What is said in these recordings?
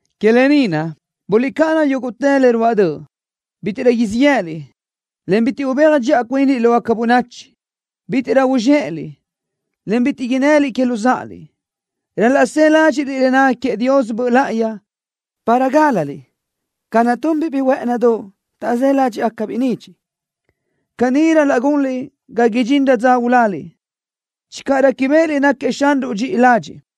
Que lë ni naʼ, guliʼcáʼana yúguʼtë le ruáʼ döʼ. Bítiʼrö siʼ yë́ʼëliʼ, en bitiʼ ubéaj dxiʼa cuinliʼ lógaca bönachi. Bítiʼrö uzxéʼeliʼ, en bitiʼ innëliʼ que luzáʼaliʼ. Ral-laʼ së ládxiʼliʼ le naca queëʼ Dios Böʼ Láʼayi para gálaliʼ ca naʼ tunbiʼ biʼi huë́ʼënidoʼ, taʼzë́ ládxiʼbiʼ nidxiʼ. Caní ral-laʼ gunliʼ ga idxinrö dza uláliʼ, channö réquibeʼeliʼ náquiëʼ Xanruʼ dxiʼi ladxiʼ.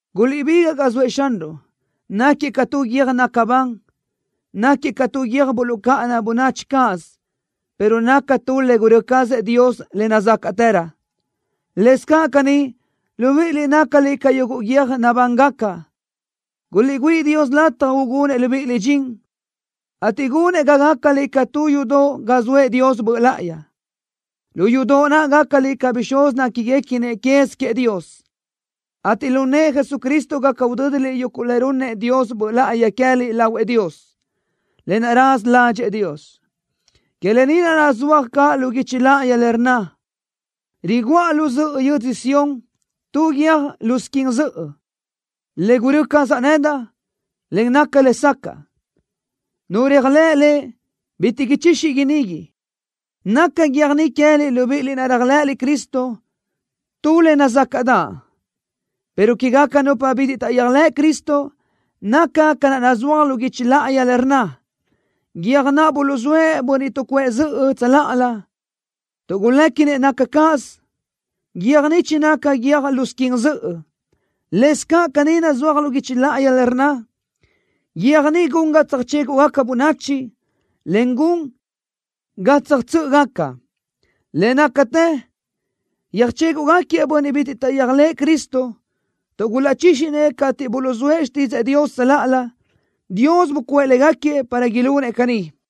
Guliʼbigaʼ ga zoëʼ Xanruʼ. Náquiëʼ ca tu guiö́j naca ban. Náquiëʼ ca tu guiö́j buluʼcáʼana bönachi cáʼasö pero naca tu le gurö́ cazëʼ Dios le nazácaʼtërö. Lëscaʼ caní, libíʼiliʼ nácaliʼ ca yuguʼ guiö́j nabángaca. Guliʼgüíʼ Dios lataj ugunëʼ libíʼiliʼ dxin, ateʼ gunëʼ ga gácaliʼ ca tu yudoʼ ga soëʼ Dios Böʼ Láʼayi. Lu yudoʼ naʼ gácaliʼ ca bixúz néquiguequinëʼ quez queëʼ Dios, ateʼ lu nëʼë Jesucristo gaca udö́diliʼ yuguʼ le runnëʼ Dios Böʼ Láʼayi queë́liʼ lahuëʼ Dios, lë naʼ raza ládxëʼë Dios. Que lë ni naʼ nazúaj caʼ lu guichi láʼayi le rnna: Riguʼa lu zöʼö yödzö Sión tu guiö́j lo squin zöʼö, le gurö́ cazaʼ nedaʼ, en naca lesacaʼ. Nu réajlëʼ Lëʼ, bitiʼ ichixi inigui. Naca guiö́j ni queë́liʼ libíʼiliʼ naʼ réajlëʼëliʼ Cristo tu le nazácaʼdaʼ, pero quégaca nupa bitiʼ taʼyéajlëʼ Cristo, naca ca naʼ nazúaj lu guichi láʼayi le rnna: Guiö́j naʼ buluʼzóëʼ bönniʼ tuʼcuʼë zöʼö tsöláʼalö, tuʼ guléquinëʼ naca cáʼasö, guiö́j ni chinaca guiö́j lo squin zöʼö. Lëscaʼ caní nazúaj lu guichi láʼayi le rnna: Guiö́j ni gun ga tsöjchéguʼgaca bönachi, en gun ga tsöjtsö́ʼögaca. Le nácatë yöjchéguʼgaquiëʼ bönniʼ bitiʼ taʼyéajlëʼë Cristo, tuʼ gulaʼchíxinëʼ cateʼ buluʼzóëʼ xtídzëʼë Dios tsöláʼalö. Dios bucuʼë légaquiëʼ para ilunëʼ caní.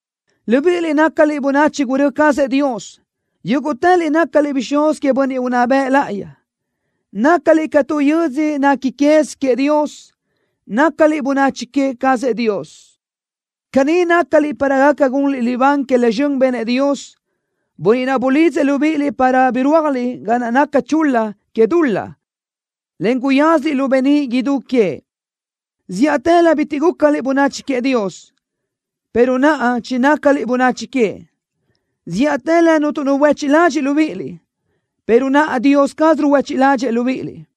Libíʼiliʼ nácaliʼ bönachi gurö́ cazëʼ Dios. Yúguʼtëliʼ nácaliʼ bixúz queëʼ Bönniʼ Unná Bëʼ Láʼayi. Nácaliʼ ca tu yödzö nequi quez queëʼ Dios. Nácaliʼ bönachi que cazëʼ Dios. Caní nácaliʼ para gaca gunliʼ libán que le zxön benëʼ Dios, Bönniʼ naʼ bulidzëʼ libíʼiliʼ para birúajliʼ ga naca chul-la que dul-laʼ, en guyázaliʼ lu beníʼ idú queëʼ. Zíʼatëlö bitiʼ gúcaliʼ bönachi queëʼ Dios, pero naʼa chinácaliʼ bönachi queëʼ. Zíʼatëlö cuntu nu buéchiʼ ladxiʼ libíʼiliʼ, pero naʼa Dios caz ruhuéchiʼ ládxëʼë libíʼiliʼ.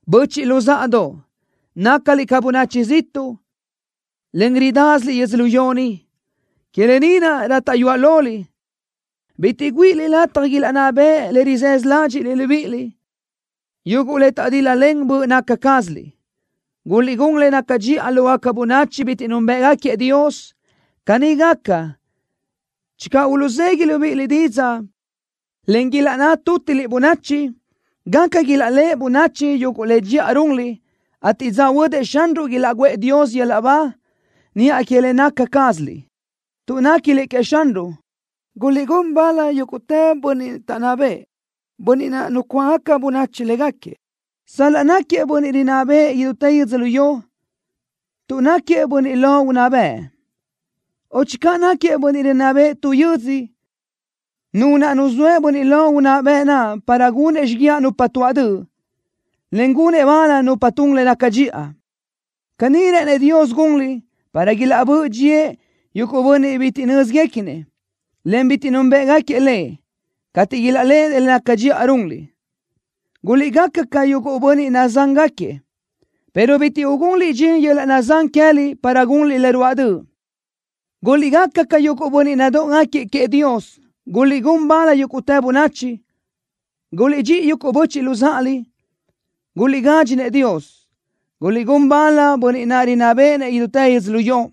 Böchiʼ luzáʼadoʼ, nácaliʼ ca bönachi ziʼtuʼ, en ridásiliʼ yödzölió ni. Que lë ni naʼ, rátaʼyuaʼ loliʼ, bitiʼ güíʼiliʼ lataj ilaʼnná beʼe le rizësö ládxiʼliʼ libíʼiliʼ, yuguʼ le taʼdíl-lalen böʼ naca cázaliʼ. Guliʼgún le naca dxiʼa lógaca bönachi bitiʼ núnbëʼgaquiëʼ Dios. Caní gaca, channö uluʼzegui libíʼiliʼ didzaʼ, en ilaʼnná tútiliʼ bönachi, gaca ilaʼléʼe bönachi yuguʼ le dxiʼa runliʼ, ateʼ dza huödëʼ Xanruʼ ilaʼguʼë Dios yöl-laʼ ba niʼa que le naca cázaliʼ. Tuʼ néquiliʼ queëʼ Xanruʼ, guliʼgún bal yúguʼtë bönniʼ taʼnná bëʼë, bönniʼ naʼ nucuáʼagaca bönachi légaquiëʼ, sal-laʼ náquiëʼ bönniʼ rinná béʼenëʼ idútë yödzölió, tuʼ náquiëʼ bönniʼ lo unná bëʼ, o channö náquiëʼ bönniʼ rinná béʼenëʼ tu yödzö, nu naʼ nuzóëʼ bönniʼ lo unná bëʼ naʼ para gunëʼ xíguiaʼ nupa tuaʼ döʼ, en gunëʼ bal nupa tun le naca dxiʼa. Caní rë́ʼënëʼ Dios gunliʼ para ilaʼbö́ʼ dxíëʼ yuguʼ bönniʼ bitiʼ bi nö́zguequinëʼ, en bitiʼ núnbëʼgaquiëʼ Lëʼ, cateʼ ilaʼléʼenëʼ le naca dxiʼa naʼ runliʼ. Guliʼgaca ca yuguʼ bönniʼ nazángaquiëʼ, pero bitiʼ ugunliʼ dxin yöl-laʼ nazán queë́liʼ para gunliʼ le ruáʼ döʼ. Guliʼgaca ca yuguʼ bönniʼ nadóʼogaquiëʼ queëʼ Dios. Guliʼgún bal yúguʼtë bönachi. Guliʼdxíʼi yuguʼ böchiʼ luzáʼaliʼ. Guliʼgadxi-nëʼ Dios. Guliʼgún bal bönniʼ naʼ rinná béʼenëʼ idútë yödzölió.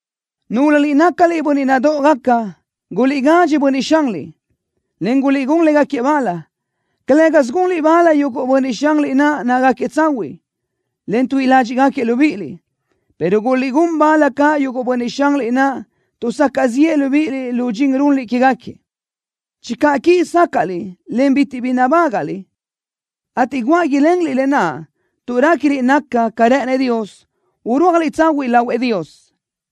Núlöliʼ nácaliʼ bönniʼ nadóʼogaca, guliʼgadxi bönniʼ xanliʼ, en guliʼgún légaquiëʼ bal, calë́gasö gunliʼ bal yuguʼ bönniʼ xanliʼ naʼ nácagaquiëʼ tsahuiʼ, en tuíʼi ládxiʼgaquiëʼ libíʼiliʼ, pero guliʼgún bal caʼ yuguʼ bönniʼ xanliʼ naʼ tuʼsacaʼ ziʼë libíʼiliʼ lu dxin runliʼ quégaquiëʼ. Channö quíʼi sácaʼliʼ, en bitiʼ bi nabágaʼliʼ, ateʼ guáʼ ilenliʼ lë naʼ tuʼ réquiliʼ naca ca rë́ʼënëʼ Dios, urúajliʼ tsahuiʼ lahuëʼ Dios.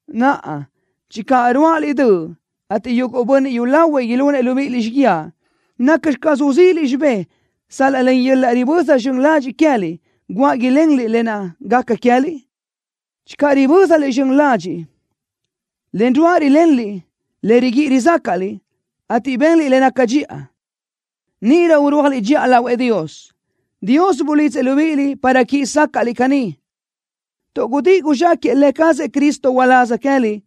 Naʼa, channö ruáʼaliʼ döʼ, ateʼ yuguʼ bönniʼ yúlahuiʼ ilunëʼ libíʼiliʼ xíguiaʼ, ¿nacxi caz uzíʼiliʼ xibé sal-laʼ len yöl-laʼ riböza zxön ladxiʼ queë́liʼ guáʼ ilenliʼ lë naʼ gaca queë́liʼ? Channö ribö́zaliʼ zxön ladxiʼ, en ruáʼ rilenliʼ le riguíʼi rizácaʼliʼ, ateʼ benliʼ le naca dxiʼa, níʼirö urúajliʼ dxiʼa lahuëʼ Dios. Dios bulidzëʼ libíʼiliʼ para quíʼi sácaʼliʼ caní, tuʼ gudíʼi guzxáquëʼë Lë cazëʼ Cristo uláz queë́liʼ,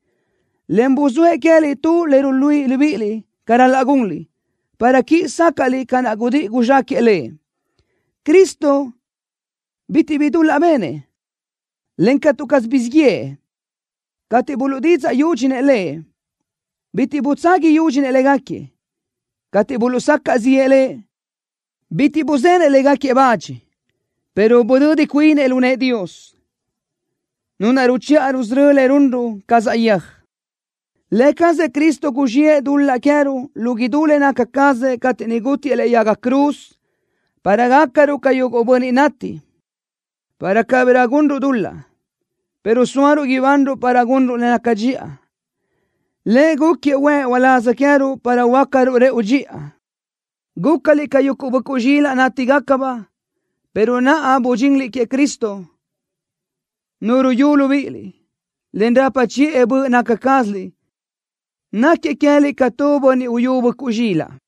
en buzóëʼ queë́liʼ tu le ruluíʼi libíʼiliʼ ca ral-laʼ gunliʼ, para quíʼi sácaʼliʼ ca naʼ gudíʼi guzxáquëʼë Lëʼ. Cristo bitiʼ bi dul-laʼ benëʼ, en catu caz guzxíʼ yëʼë. Cateʼ buluʼdídzaʼ yúdxinëʼ Lëʼ, bitiʼ butsagui yúdxinëʼ légaquiëʼ. Cateʼ buluʼsacaʼ ziʼë Lëʼ, bitiʼ buzenëʼ légaquiëʼ le bach, pero budödi cuinëʼ lu nëʼë Dios, Nu naʼ ruchiʼa rusörö́ëʼ le runruʼ ca saʼyéaj. Lë cazëʼ Cristo guzxiʼë dul-laʼ queë́ruʼ lu idú le naca cazëʼ cateʼ niʼ gútiëʼ lëʼe yaga cruz, para gácaruʼ ca yuguʼ bönniʼ nati, para cabirö gunruʼ dul-laʼ, pero sóaruʼ ibanruʼ para gunruʼ le naca dxiʼa. Lëʼ gúquiëʼ huëʼ uláz queë́ruʼ para huöácaruʼ rëʼu dxiʼa. Gúcaliʼ ca yuguʼ böʼcuʼ zxilaʼ nanítigacabaʼ, pero naʼa budxinliʼ queëʼ Cristo, Nu ruyú libíʼiliʼ, en rapa chiʼë böʼ naca cázaliʼ. Náquiëʼ queë́liʼ ca tuʼ bönniʼ uyú böʼcuʼ zxilaʼ.